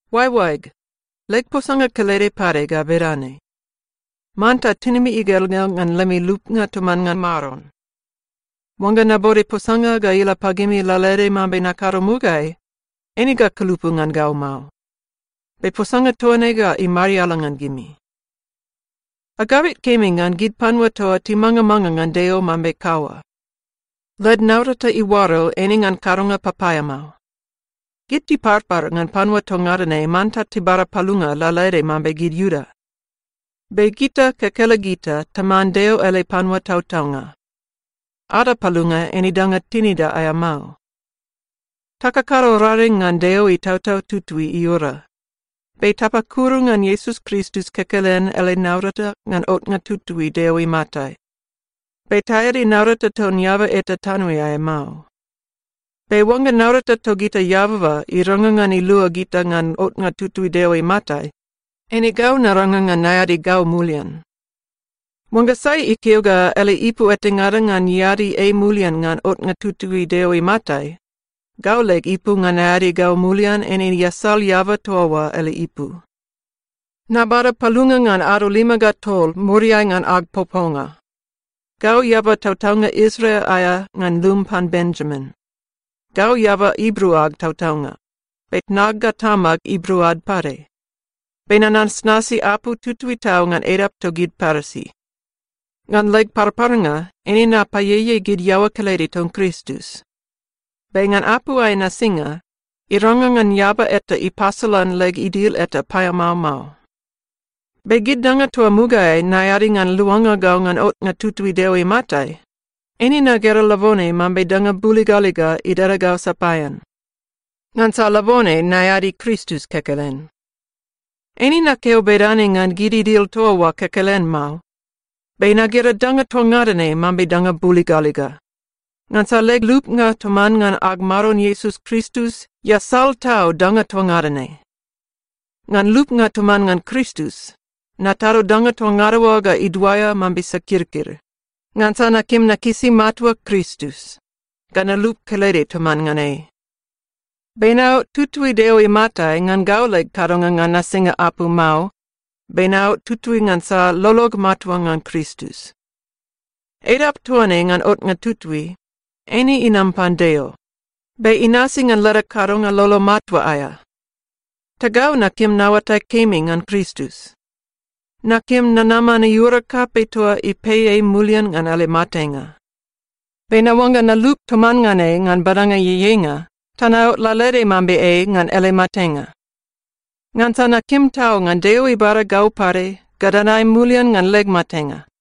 Oaeoaeg, leg posanga kelede pade ga bedane: Manta tinimi igelgel ngan lemi lupnga toman ngan Maron. Oangga nabode posanga ga ila pagimi lalaede mambe nakado mugaeai, eine ga kulupu ngan gau mao. Be posanga toa ne ga imariala ngan gimi. Agabit kemi ngan gid panua toa timangamanga ngan Deo mambe kaua. Led naurata iuaro eine ngan kadonga papaeamao. Gid tiparpar ngan panua toa ngada ne manta tibada palunga lalaede mambe gid Iuda. Be gita kekelegita taman Deo ele panua tautaunga. Ada palunga eine danga tinida aea mao. Takakado raring ngan Deo Itautau Tutui iura. Be tapakuru ngan Iesus Kristus kekelen ele naurata ngan otnga tutui Deo imatai. Be taeadi naurata ton eaba eta tanoeai mao. Be oangga naurata togita eababa irangrang ngan ilua gita ngan otnga tutui Deo imatai, eine gau narangrang ngan naeadi gau mulian. Oangga sai ikeo ga ele ipu etangada ngan iadi ei mulian ngan otnga tutui Deo imatai, gau leg ipu ngan naeadi gau mulian eine iasal eaba toa oa ele ipu. Nabada palunga ngan ado lima ga tol muriai ngan ag poponga. Gau eaba tautaunga Israel aea ngan lum pan Benjamin. Gau eaba Ibru ag tautaunga, be tnag ga tamag Ibru ad pade. Be nanasnasi apu tutui tau ngan edap togid Parisi. Ngan leg parparnga, eine napaieiei gid iaoa kelede ton Kristus. Be ngan apu aea nasinga, irangrang ngan eaba eta ipasolan leg idil eta paeamao mao. Be gid danga toa mugaeai naeadi ngan luanga gau ngan otnga tutui Deo imatai, eine nagera labone mambe danga buligaliga idada gau sapaean. Ngansa labone naeadi Kristus kekelen. Eine nakeo bedane ngan gid idil toa oa kekelen mao, be nagera danga toa ngada ne mambe danga buligaliga, ngansa leg lupnga toman ngan ag Maron Iesus Kristus iasal tau danga toa ngada ne. Ngan lupnga toman ngan Kristus, natado danga toa ngada oa ga iduaea mambe sakirkir, ngansa nakim nakisi matua Kristus, ga nalup kelede toman ngan ei. Be naot tutui Deo imatai ngan gau leg kadonga ngan nasinga apu mao, be naot tutui ngansa lolog matua ngan Kristus. Edap toa ne ngan otnga tutui, eine inam pan Deo, be inasi ngan leda kadonga lolo matua aea. Ta gau nakim naoatai kemi ngan Kristus. Nakim nanaman iura kapei toa ipei ei mulian ngan ele matenga. Be naoangga nalup toman ngan ei ngan badanga ieieinga ta naot lalaede mambe ei ngan ele matenga. Ngansa nakim tau ngan Deo ibada gau pade ga nadae mulian ngan leg matenga.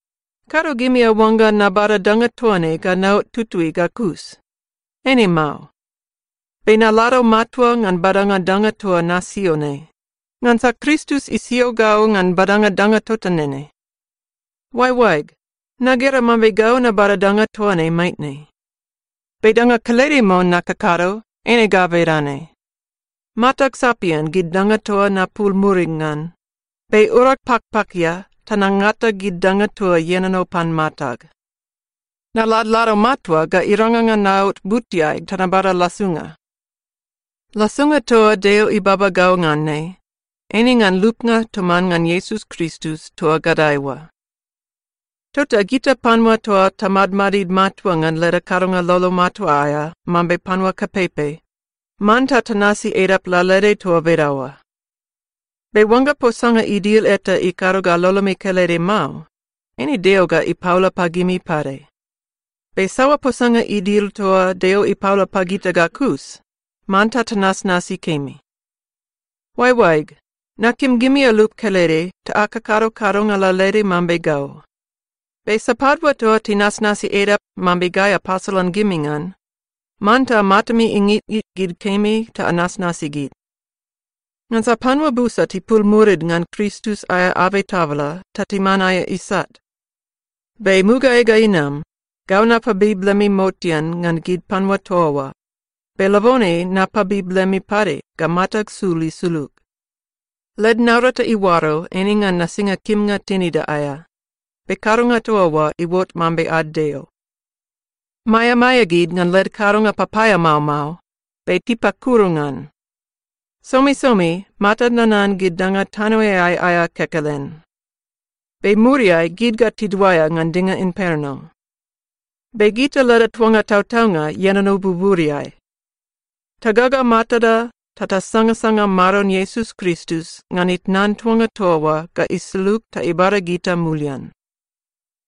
Kado gimi aoangga nabada danga toa ne ga naot tutui ga kus. Eine mao. Be nalado matua ngan badanga danga toa nasio ne, ngansa Kristus isio gau ngan badanga danga tota nene. Oaeoaeg, nagera mambe gau nabada danga toa ne maitne. Be danga kelede mon nakakado, eine ga bedane: Matag sapian gid danga toa napul murig ngan, be urag pakpakia ta nangata gid danga toa ienono pan matag. Naladlado matua ga irangrang ngan naot butiai ta nabada lasunga. Lasunga toa Deo ibaba gau ngan ne, eine ngan lupnga toman ngan Iesus Kristus toa gadae oa. Tota gita panua toa tamadmadid matua ngan leda kadonga lolo matua aea mambe panua kapeipei, manta tanasi edap lalaede toa bedaoa. Be oangga posanga idil eta ikado ga lolomi kelede mao, eine Deo ga ipaola pagimi pade. Be saoa posanga idil toa Deo ipaola pagita ga kus, manta tanasnasi kemi. Oaeoaeg, nakim gimi alup kelede ta akakado kadonga lalaede mambe gau. Be sapadua toa tinasnasi edap mambe gai apasolan gimi ngan, manta matami ingitngit gid kemi ta anasnasi gid. Ngansa panua busa tipul murid ngan Kristus aea abei tabala ta timan aea isat. Be mugaeai ga inam, gau napabib lemi motean ngan gid panua toa oa, be labone napabib lemi pade ga matag sul isulug. Led naurata iuaro eine ngan nasinga kimnga tinida aea, be kadonga toa oa iuot mambe ad deo. Maeamaea gid ngan led kadonga papaeamao mao be tipakuru ngan. Somisomi matad nanan gid danga tanoeai aea kekelen. Be muriai gid ga tiduaea ngan dinga imperno. Be gita leda tuanga tautaunga ienono buburiai. Tagaga matada ta tasangasanga Maron Iesus Kristus ngan itnan tuanga toa oa ga isulug ta ibada gita mulian.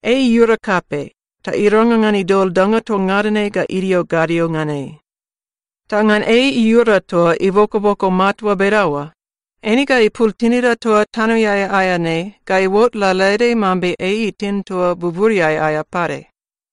Ei iura kapei ta irangrang ngan idol danga toa ngada ne ga idio gadio ngan ei. Ta ngan ei iura toa ibokoboko matua bedaoa, eine ga ipul tinida toa tanoeai aea ne ga iuot lalaede mambe ei itin toa buburiai aea pade.